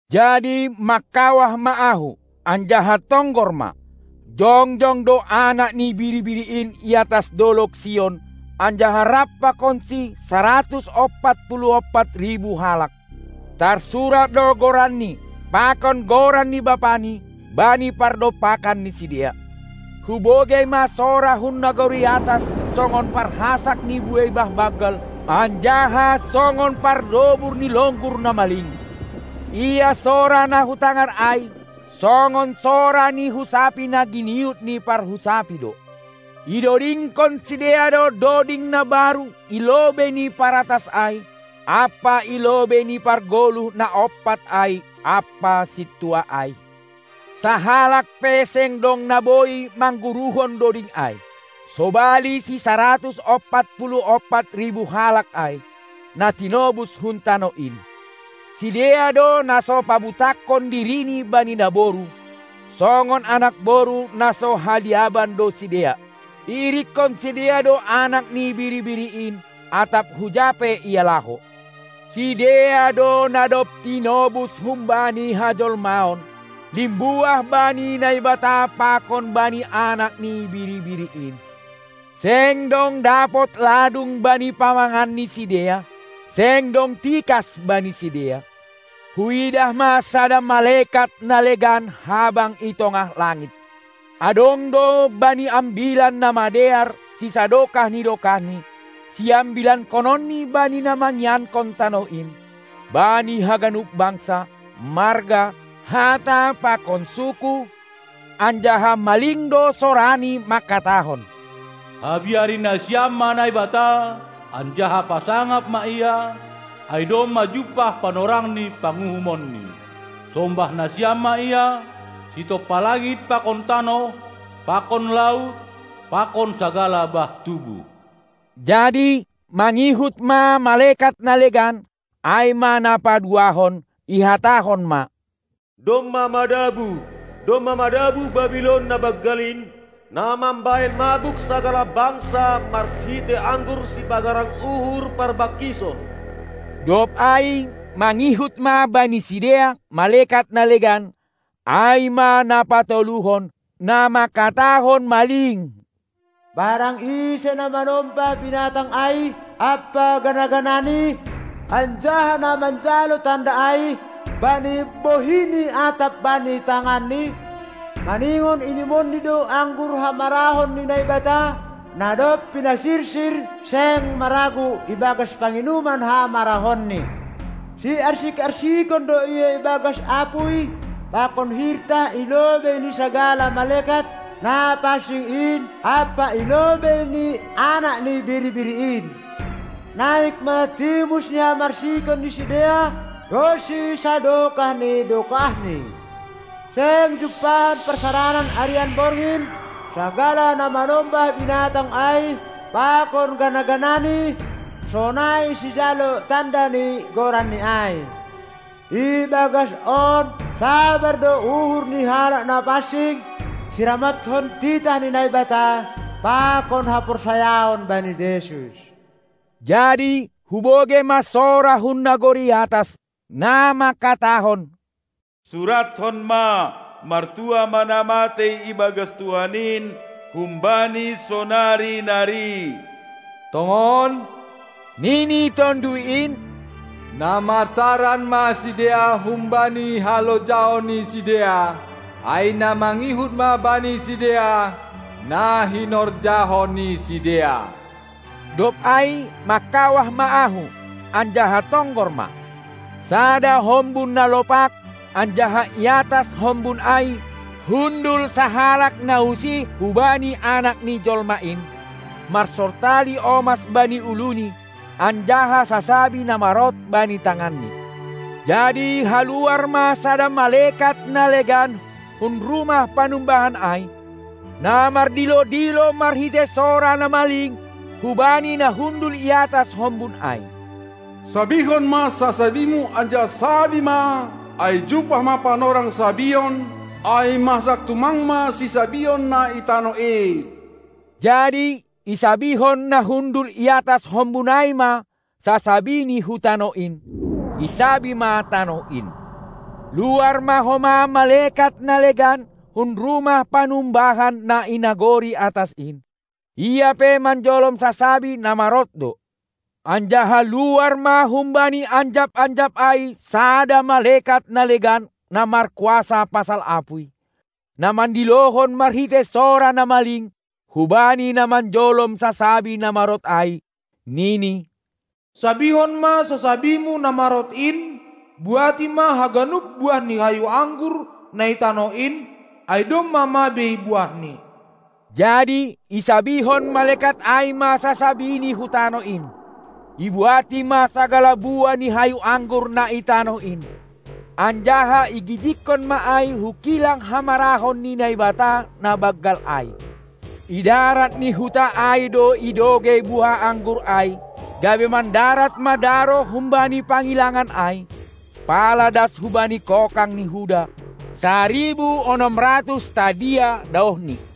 Jadi mangkawah ma ahu, anjaha tonggor ma, jongjong do Anak ni Biri-biri in i atas dolog Sion anjaha rap pakonsi saratus ompat puluh ompat ribu halak; tarsurat do goranNi pakon goran ni BapaNi bani pardompakan ni sidea. Hubogei ma sora hun nagori atas songon parhasak ni buei bah banggal anjaha songon pardobur ni longgur na maling; ia sora na hutangar ai, songon sora ni husapi na giniut ni parhusapi do. Idodingkon sidea do doding na baru i lobei ni paratas ai ampa i lobei ni pargoluh na ompat ai ampa sintua ai; sahalak pe seng dong na boi mangguruhon doding ai, sobali sisaratus ompat puluh ompat ribu halak ai, na tinobus hun tanoh in. Sidea do na so pabutakhon dirini bani naboru; songon anakboru na so haliaban do sidea. Iirikkon sidea do Anak ni Biri-biri in, atap huja pe Ia laho. Sidea do na dob tinobus humbani hajolmaon, limbuah bani Naibata pakon bani Anak ni Biri-biri in. Seng dong dapot ladung bani pamangan ni sidea. Seng dong tikas bani sidea. Huidah ma sada malekat na legan habang i tongah langit; adong do bani Ambilan Namadear sisadokah ni dokahni, siambilankononni bani na mangiankon tanoh in, bani haganup bangsa, marga, hata pakon suku, anjaha maling do sorani mangkatahon: Habiari nasiam ma Naibata anjaha pasangap ma Ia, ai domma jumpah panorang ni panguhumonNi! Sombah nasiam ma Ia, sitompa langit pakon tanoh pakon laut pakon sagala bah tubuh! Jadi mangihut ma malekat na legan, ai ma na paduahon, ihatahon ma: Domma madabuh, domma madabuh Babilon na banggal in, na mambahen mabuk sagala bangsa marhitei anggur sipagarang uhur parbangkison. Dob ai mangihut ma bani sidea malekat na legan, ai ma na patoluhon, na manghatahon maling: Barang ise na manombah binatang ai ampa gana-ganani, anjaha na manjalo tanda ai bani bohini atap bani tangani, maningon inumonni do anggur hamarahon ni Naibata, na dob pinasirsir seng maragu ibagas panginuman hamarahonni; siarsik-arsikon do ia ibagas apuy pakon hirtah i lobei ni sagala malekat na pansing in ampa i lobei ni Anak ni Biri-biri in. Naik ma timus ni hamarsikon ni sidea ronsi sadokah ni dokahni. Seng jumpahan parsaranan arian borgin sagala na manombah binatang ai pakon gana-ganani, sonai sijalo tanda ni goranni ai. Ibagas on sabar do uhur ni halak na pansing, siramothon titah ni Naibata pakon haporsayaon bani Jesus. Jadi hubogei ma sora hun nagori atas, na mangkatahon: Surathon ma: Martuah ma na matei ibagas Tuhan in humbani sonari nari. Tongon, nini Tonduy in, na marsaran ma sidea humbani halojaon ni sidea, ai na mangihut ma bani sidea na hinorjahon ni sidea. Dob ai mangkawah ma ahu, anjaha tonggor ma: Sada hombun na lopak, anjaha i atas hombun ai hundul sahalak na usih hubani Anak ni Jolma in, marsortali omas bani uluNi anjaha sasabi na marot bani tanganni. Jadi haluar ma sada malekat na legan hun rumah panumbahan ai, na mardilo-dilo marhitei sora na maling hubani na hundul i atas hombun ai: Sabihon ma sasabimu anjaha sabi ma, ai jumpah ma panorang sabion, ai masak tumang ma sisabion na i tanoh in. Jadi isabihon na hundul i atas hombun ai ma sasabini hu tanoh in, isabi ma tanoh in. Luar ma homa malekat na legan hun rumah panumbahan na i nagori atas in, ia pe manjolom sasabi na marot do. Anjaha luar ma humbani anjap-anjap ai sada malekat na legan na markuasa pasal apuy, na mandilohon marhitei sora na maling hubani na manjolom sasabi na marot ai, nini: Sabihon ma sasabimu na marot in, buati ma haganup buah ni hayu anggur na i tanoh in, ai domma mabei buahni. Jadi isabihon malekat ai ma sasabini hu tanoh in, ibuati ma sagala buah ni hayu anggur na i tanoh in, anjaha igijigkon ma ai hu kilang hamarahon ni Naibata na banggal ai. Idarat ni huta ai do idogei buah anggur ai, gabe mandarat ma daroh humbani pangilangan ai pala das hubani kokang ni huda, saribu onom ratus stadia daohni.